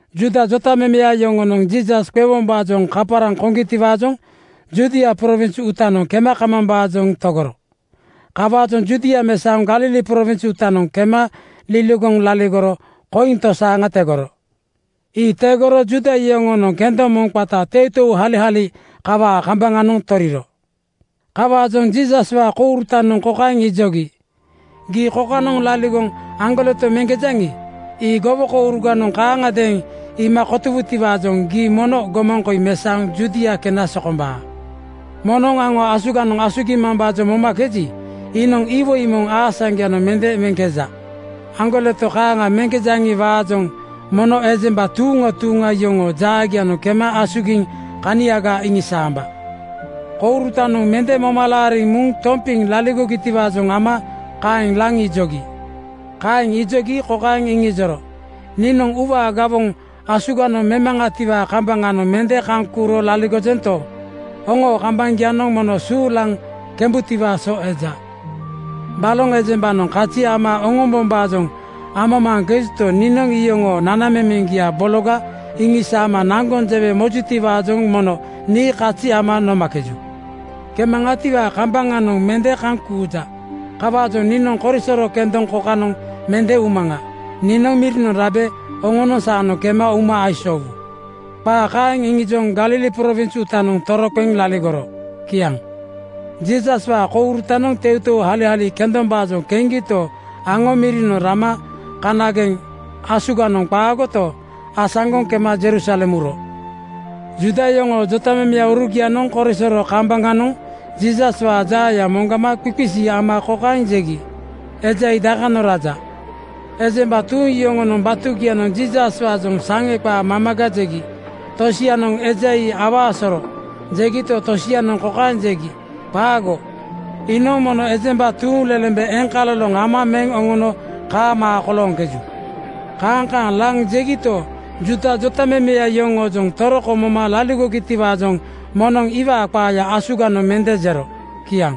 Juuda jotamemeya yoŋonoŋ Jiisas qewombaajoŋ kaparaŋ koŋgitiwaajoŋ Judia prowins uutanoŋ kema kamambaajoŋ togoro. Kawaajoŋ Judia mesaoŋ Galili prowins uutanoŋ kema liligoŋ laligoro koiŋ tosaaŋa tegoro. Ii tegoro Juuda yoŋoonoŋ kendoŋ moŋ qata teuteuhalihali kawaa kambaŋanoŋ toriro. Kawaajoŋ Jiisaswaa kourutanoŋ kokaeŋ ijogi, “Gii kokanoŋ laligoŋ aŋgoleto meŋkejaŋi, ii gowokouruganoŋ kaaŋagadeeŋ iima kotowutiwaajoŋ gii mono gomaŋ koi mesaoŋ Judia kena sokombaa. Moŋnoŋ aŋo asuganoŋ asugimambaajoŋ momakeji, iinoŋ iwoi moŋ aasaŋgoyanoŋ mende meŋkeja. Aŋgoleto kaaŋa meŋkejaŋi-waajoŋ mono ejemba tuuŋa tuuŋa yoŋoo jaagianoŋ kema asugiŋ kaniaga iŋisaamba.” Kourutanoŋ mende moma laariŋ muŋ tompiŋ laligogitiwaajoŋ ama kaeŋ laŋ ijogi. Kaeŋ ijogi kokaeŋ iŋijoro, “Niinoŋ uuwaa gawoŋ asuganoŋ memaŋatiwaa kambaŋanoŋ mende kaŋ kuuro laligojento, oŋoo kambaŋgianoŋ mono suulaŋ kembutiwaa so eja. Baloŋ ejembanoŋ kazi ama oŋombombaajoŋ amamaaŋkejuto, niinoŋ iyoŋoo nana-memeŋgia bologa iŋisaama naŋgoŋ jewe mojutiwaajoŋ mono nii kazi ama nomakeju. Kemaŋatiwaa kambananoŋ mende kaŋ kuuja. Kawaajoŋ niinoŋ korisoro kendoŋ kokanoŋ mende umaŋa. Niinoŋ mirinoŋ rabe oŋonoŋ saanoŋ kema uma aisoowu.” Qaa kaeŋ iŋijoŋ Galili prowins uutanoŋ toroqeŋ laligoro. Kiaŋ. Jiisaswaa kourutanoŋ teuteuhalihali kendombaajoŋ keŋgito, aŋo mirinoŋ rama kanageŋ asuganoŋ qaagoto, asaŋgoŋ kema Jerusalem uro. Juuda yoŋoo jotamemeurugianoŋ korisoro kambaŋanoŋ Jiisaswaa jaaya moŋgama qisiqisi ama kokaeŋ jegi, “Eja ii dakanoŋ raja?” Ejemba tuuŋ yoŋonoŋ batugianoŋ Jiisaswaajoŋ saŋe qaa mamaga jegi. Tosianoŋ “Eja ii awaa soro,” jegito, tosianoŋ kokaeŋ jegi, “Qaago! Iinoŋ mono ejemba tuuŋlelembe eŋkaloloŋ ama meŋ oŋono kaamaa kolooŋkeju.” Kaaŋ kaaŋ laŋ jegito, Juuda jotamemeya yoŋoojoŋ toroko moma laligogitiwaajoŋ moŋnoŋ iwaa qaaya asuganoŋ mende jero. Kiaŋ.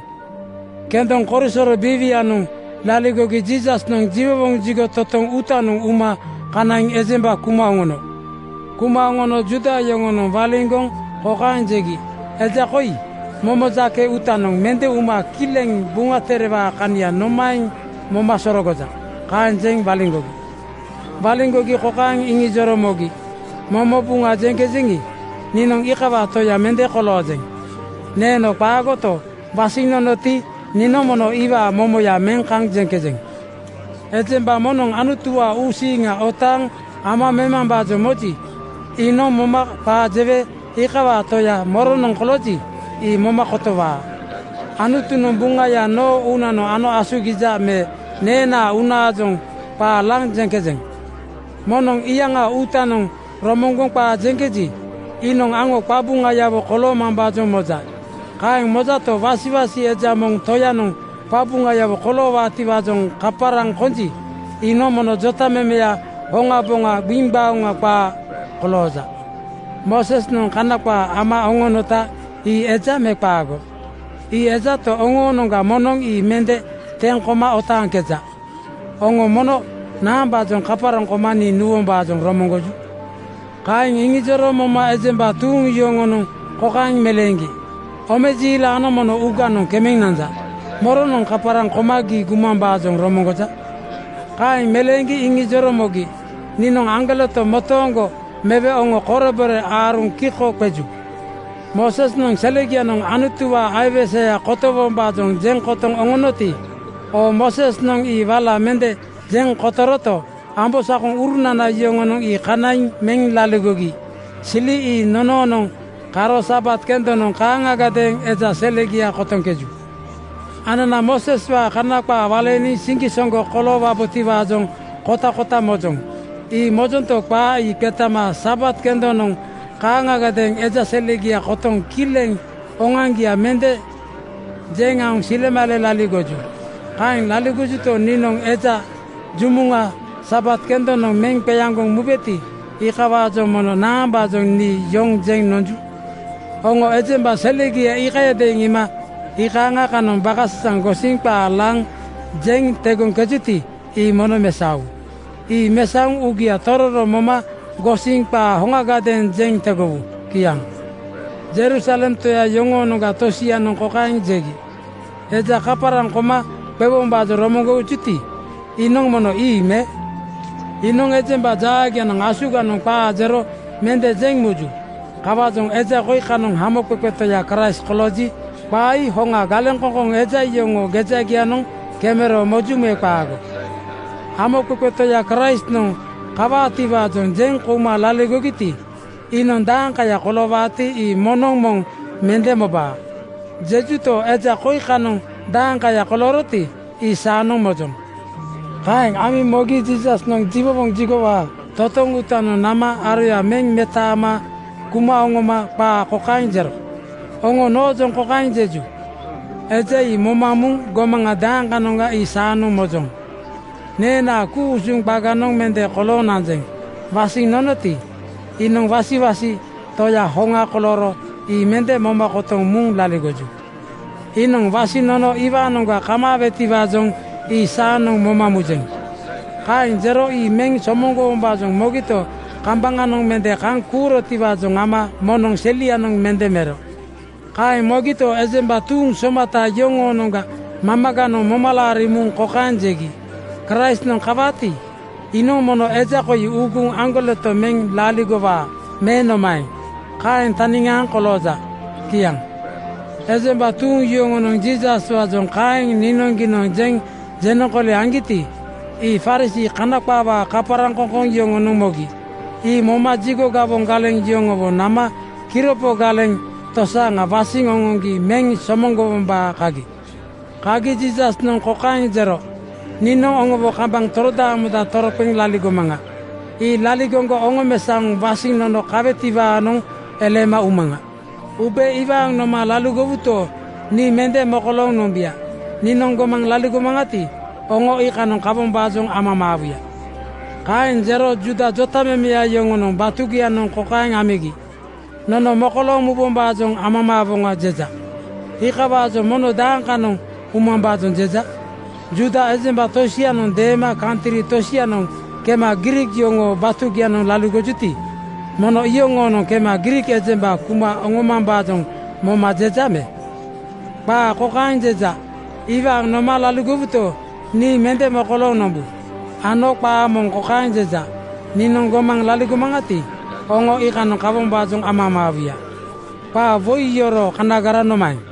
Kendoŋ korisoro biiwianoŋ laligogi Jiisasnoŋ jiwowoŋ jigo totoŋ uutanoŋ uma kanaiŋ ejemba kuma oŋono. Kuma oŋono Juuda yoŋonoŋ waliŋgoŋ kokaeŋ jegi, “Eja koi momo jake uutanoŋ mende uma kileŋ Buŋa Terewaa kania nomaeŋ moma sororogoja?” Kaeŋ jeŋ waliŋgogi. Waliŋgogi kokaeŋ iŋijoro mogi, “Momo Buŋa jeŋkejeŋi, niinoŋ iikawaa Toya mende koloojeŋ. Neeno qaagoto, wasiŋ nonoti, niinoŋ mono iwaa momoya meŋ kaŋ jeŋkejeŋ. Ejemba moŋnoŋ Anutuwaa uusiiŋa otaaŋ ama memambaajoŋ moji, iinoŋ momo qaa jewe iikawaa Toya moronoŋ kolooji, ii moma kotowaa. Anutunoŋ Buŋaya noo uunanoŋ ano asugija me neenaa uunaajoŋ qaa laŋ jeŋkejeŋ? “Moŋnoŋ iyaŋaa uutaanoŋ romoŋgoŋ qaa jeŋkeji, iinoŋ aŋo qabuŋayawo koloomambaajoŋ moja. Kaeŋ mojato, wasiwasi eja moŋ toyanoŋ qabuŋayawo koloowaatiwaajoŋ kaparaŋ konji, iinoŋ mono jotamemeya hoŋaboŋa gbiŋgbaoŋa qaa kolooja. Moosesnoŋ Kana qaa ama oŋonota ii eja me qaago? Ii ejato, oŋoonoŋga moŋnoŋ ii mende teŋ koma otaaŋkeja. Oŋo mono naambaajoŋ kaparaŋ koma nii nuwombaajoŋ romoŋgoju?” Kaeŋ iŋijoro moma ejemba tuuŋ yoŋonoŋ kokaeŋ meleeŋgi, “Omejiilanoŋ mono uuganoŋ kemeŋ nanja. Moronoŋ kaparaŋ koma gii gumambaajoŋ romoŋgoja?” Kaeŋ meleeŋgi iŋijoro mogi, “Niinoŋ aŋgoleto motooŋgo mewe oŋo korebore aaruŋ kiko qeju. Moosesnoŋ selegianoŋ Anutuwaa aiwese kotowombaajoŋ jeŋ kotoŋ oŋonoti, oo Moosesnoŋ ii wala mende jeŋ kotoroto, ambosakoŋurunana yoŋonoŋ ii kanaiŋ meŋ laligogi sili ii nonoonoŋ karo Sabat kendonoŋ kaaŋagadeeŋ eja selegia kotoŋkeju. “Anana Mooseswaa Kana qaa waleeniŋ siŋgisoŋgo koloowa-botiwaajoŋ kotakota mojoŋ. Ii mojonto, qaa ii qetama Sabat kendonoŋ kaaŋagadeeŋ eja selegia kotoŋ kileŋ oŋoaŋgia mende jeŋ aoŋ silemale laligoju. Kaeŋ laligojuto, niinoŋ eja jumuŋa Sabat kendonoŋ meŋ qeaŋgoŋ mubeti, iikawaajoŋ mono naambaajoŋ nii yoŋ jeŋ nonju? Oŋo ejemba selegia iikayadeeŋ iima iikaaŋa kanoŋ bakasasaŋ gosiŋ qaa laŋ jeŋ tegoŋkejuti, ii mono mesaowu. Ii mesaoŋ uugia tororo moma gosiŋ qaa hoŋagadeeŋ jeŋ tegowu.” Kiaŋ. Jerusalem toya yoŋoonoŋga tosianoŋ kokaeŋ jegi, “Eja kaparaŋ koma qewombaajoŋ romoŋgojuti, iinoŋ mono ii me? Iibu, iinoŋ ejemba jaagianoŋ asuganoŋ qaa jero mende jeŋ muju. Kawaajoŋ eja koi kanoŋ Hamoqeqe Toya Kraist kolooji, qaa ii hoŋa galeŋkoŋkoŋ eja yoŋoo gejagianoŋ kemero moju me qaago? Hamoqeqe Toya Kraistnoŋ kawaatiwaajoŋ jeŋ kouma laligogiti, iinoŋ ‘Daeŋkaya koloowaati, ii moŋnoŋ moŋ mende mobaa,’ jejuto, eja koi kanoŋ daeŋkaya kolooroti, ii saanoŋ mojoŋ.” Kaeŋ amiŋ mogi Jiisasnoŋ jiwowoŋ jigowaa totoŋ uutanoŋ nama aroya meŋ metaama kuma oŋoma qaa kokaeŋ jero, “Oŋo noojoŋ kokaeŋ jeju, ‘Eja ii moma muŋ gomaŋa dakanoŋga ii saanoŋ mojoŋ.’ Neenaa ku-usuŋ qaganoŋ mende kolooŋ nanjeŋ. Wasiŋ nonoti, iinoŋ wasiwasi Toya hoŋa kolooro ii mende moma kotoŋ muŋ laligoju. Iinoŋ wasiŋ nono iwaanoŋga kamaawetiwaajoŋ ii saanoŋ moma mujeŋ.” Kaeŋ jero ii meŋ somoŋgowombaajoŋ mogito, kambaŋanoŋ mende kaŋ kuurotiwaajoŋ ama moŋnoŋ selianoŋ mende mero. Kaeŋ mogito, ejemba tuuŋ somata yoŋoonoŋga mamaganoŋ moma laariŋ muŋ kokaeŋ jegi, “Kraistnoŋ kawaati, iinoŋ mono eja koi uuguŋ aŋgoleto meŋ laligowaa me nomaeŋ? Kaeŋ taniŋaaŋ kolooja.” Kiaŋ. Ejemba tuuŋ yoŋonoŋ Jiisaswaajoŋ kaeŋ niinoŋgiinoŋ jeŋ jenoŋkooli aŋgiti, ii Farisii (Kana qaawaa kaparaŋkoŋkoŋ) yoŋonoŋ mogi. Ii moma jigo gawoŋ galeŋ yoŋowo nama kiropo galeŋ (sikiriti) tosaaŋa wasiŋ oŋoŋgi meŋ somoŋgowombaa kagi. Kagi Jiisasnoŋ kokaeŋ jero, “Niinoŋ oŋowo kambaŋ torodaamoŋ toroqeŋ laligomaŋa. Ii laligoŋgo oŋomesaoŋ wasiŋ nono kamaawetiwaanoŋ eleema umaŋa. Ube iwaaŋ noma laligowuto, nii mende mokolooŋ nombuya. Niinoŋ gomaŋ laligomaŋati, oŋo iikanoŋ kawombaajoŋ amamaawuya.” Kaeŋ jero Juuda jotamemeya yoŋonoŋ batugianoŋ kokaeŋ amigi, “‘Nono mokolooŋ mubombaajoŋ amamaawoŋa,’ jeja. Iikawaajoŋ mono dakanoŋ umambaajoŋ jeja? Juuda ejemba tosianoŋ deema kantri tosianoŋ kema Griik yoŋoo batugianoŋ laligojuti, mono iyoŋoonoŋ kema Griik ejemba kuma oŋomambaajoŋ moma jeja me? Qaa kokaeŋ jeja, ‘Iwaaŋ noma laligowuto, nii mende mokolooŋ nombu,’ ano qaa moŋ kokaeŋ jeja, ‘Niinoŋ gomaŋ laligomaŋati, oŋo iikanoŋ kawombaajoŋ amamaawuya.’ Qaa woi yoroo kanagara nomaeŋ?”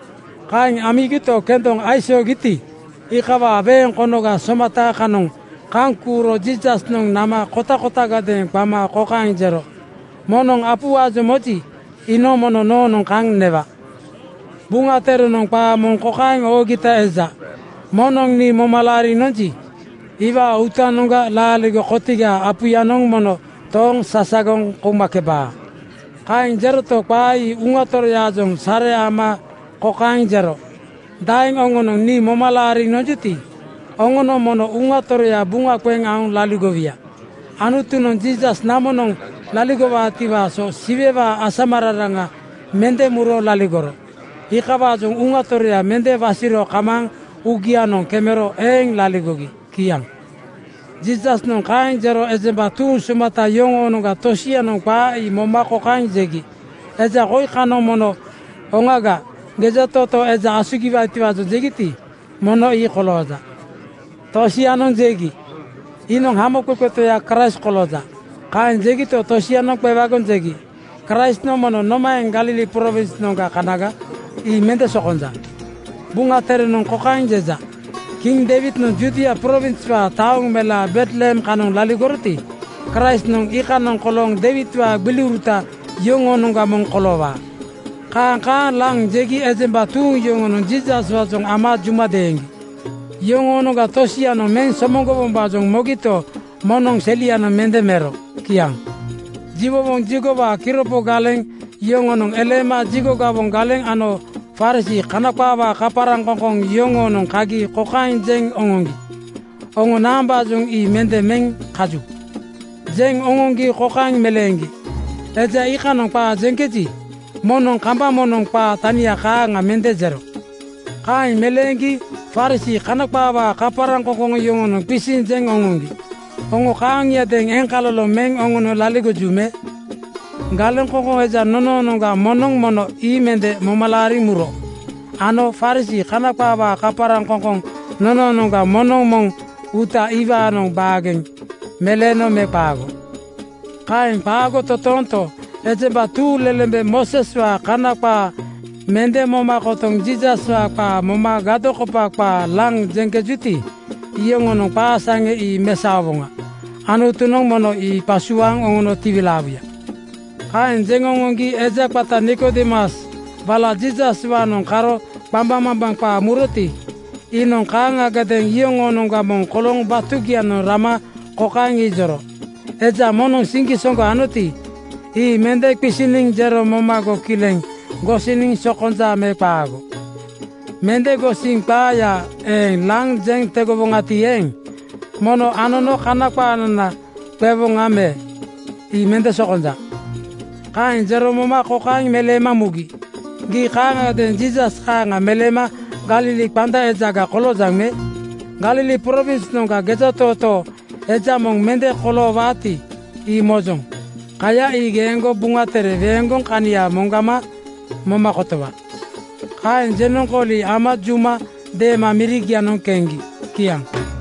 Kaeŋ amigito, kendoŋ aisoogiti, iikawaa weeŋ konoga somata kanoŋ kaŋ kuuro Jiisasnoŋ nama kotakotagadeeŋ qama kokaeŋ jero, “Moŋnoŋ apuwaajoŋ moji, iinoŋ mono noonoŋ kaŋ newa. Buŋa Terenoŋ qaa moŋ kokaeŋ oogita eja, ‘Moŋnoŋ nii moma laariŋ nonji, iwaa uutanoŋga laaligo kotigaa apuyanoŋ mono tooŋ sasagoŋ koumakebaa.’” Kaeŋ jeroto, qaa ii Uŋa Toroyaajoŋ sare ama kokaeŋ jero, “Daeŋ oŋonoŋ nii moma laariŋ nonjuti, oŋonoŋ mono Uŋa Toroya buŋa qeŋ aoŋ laligowuya.” Anutunoŋ Jiisas namonoŋ laligorotiwaa so Siwewaa asamararaŋa mende muro laligoro. Iikawaajoŋ Uŋa Toroya mende wasiro kamaaŋ uugianoŋ kemero eeŋ laligogi. Kiaŋ. Jiisasnoŋ kaeŋ jero ejemba tuuŋ somata yoŋoonoŋga tosianoŋ qaa ii moma kokaeŋ jegi, “Eja koi kanoŋ mono oŋaga gejatootoo eja asugiwaatiwaajoŋ jegiti, mono ii kolooja.” Tosianoŋ jegi, “Iinoŋ Hamoqeqe Toya Kraist kolooja.” Kaeŋ jegito, tosianoŋ qewagoŋ jegi, “Kraistnoŋ mono nomaeŋ Galili prowinsnoŋga kanaga? Ii mende sokonja. Buŋa Terenoŋ kokaeŋ jeja, ‘Kiŋ Deiwidnoŋ Judia prowinswaa taoŋ melaa Betlehem kanoŋ laligoroti, Kraistnoŋ iikanoŋa kolooŋ Deiwidwaa gbiliuruta yoŋoonoŋga moŋ koloowaa.’” Kaaŋ kaaŋ laŋ jegi ejemba tuuŋ yoŋonoŋ Jiisaswaajoŋ ama juma deeŋgi. Yoŋoonoŋga tosianoŋ meŋ somoŋgowombaajoŋ mogito, moŋnoŋ selianoŋ mende mero. Kiaŋ. Jiwowoŋ jigowaa kiropo galeŋ (sikiriti) yoŋonoŋ eleema jigo gawoŋ galeŋ ano Farisii (Kana qaawaa kaparaŋkoŋkoŋ) yoŋoonoŋ kagi kokaeŋ jeŋ oŋoŋgi, “Oŋo naambaajoŋ ii mende meŋ kaju?” Jeŋ oŋoŋgi kokaeŋ meleeŋgi, “Eja iikanoŋ qaa jeŋkeji, moŋnoŋ kambaŋ moŋnoŋ qaa tania kaaŋa mende jero.” Kaeŋ meleeŋgi Farisii (Kana qaawaa kaparaŋkoŋkoŋ) yoŋonoŋ qisiŋ jeŋ oŋoŋgi, “Oŋo kaaŋiadeeŋ eŋkaloloŋ meŋ oŋono laligoju me? Galeŋkoŋkoŋ eja nonoonoŋga moŋnoŋ mono ii mende moma laariŋ muro. Ano Farisii (Kana qaawaa kaparaŋkoŋkoŋ) nonoonoŋga moŋnoŋ moŋ uuta iwaanoŋ baageŋ meleeno me qaago? Kaeŋ qaago totoonto, ejemba tuuŋlelembe Mooseswaa Kana qaa mende moma kotoŋ Jiisaswaa qaa moma gadokopa qaa laŋ jeŋkejuti, iyoŋoonoŋ qaa seŋa ii mesaowoŋa! Anutunoŋ mono ii qasuaaŋ oŋono tiwilaawuya.” Kaeŋ jeŋ oŋoŋgi eja qata Nikodeemus wala Jiisaswaanoŋ karo qambaŋmambaŋ qaa muroti, iinoŋ kaaŋagadeeŋ iyoŋoonoŋga moŋ kolooŋ batugianoŋ rama kokaeŋ iŋijoro, “Eja moŋnoŋ siŋgisoŋgo anoti, ii mende qisiniŋ jero momago kileŋ gosiniŋ sokonja me qaago? Mende gosiŋ qaaya eeŋ laŋ jeŋ tegowoŋati eeŋ, mono anono Kana qaanana qewoŋa me? Ii mende sokombaa.” Kaeŋ jero moma kokaeŋ meleema mugi, “Gii kaaŋagadeeŋ Jiisas kaaŋa meleema Galili qanda ejaga koloojaŋ me? Galili prowinsnoŋga gejatootoo eja moŋ mende koloowaati, ii mojoŋ. Kaya ii geeŋgo Buŋa Tere weeŋgoŋ kania moŋgama moma kotowa.” Kaeŋ jenoŋkooli ama juma deema mirigianoŋ keŋgi. Kiaŋ.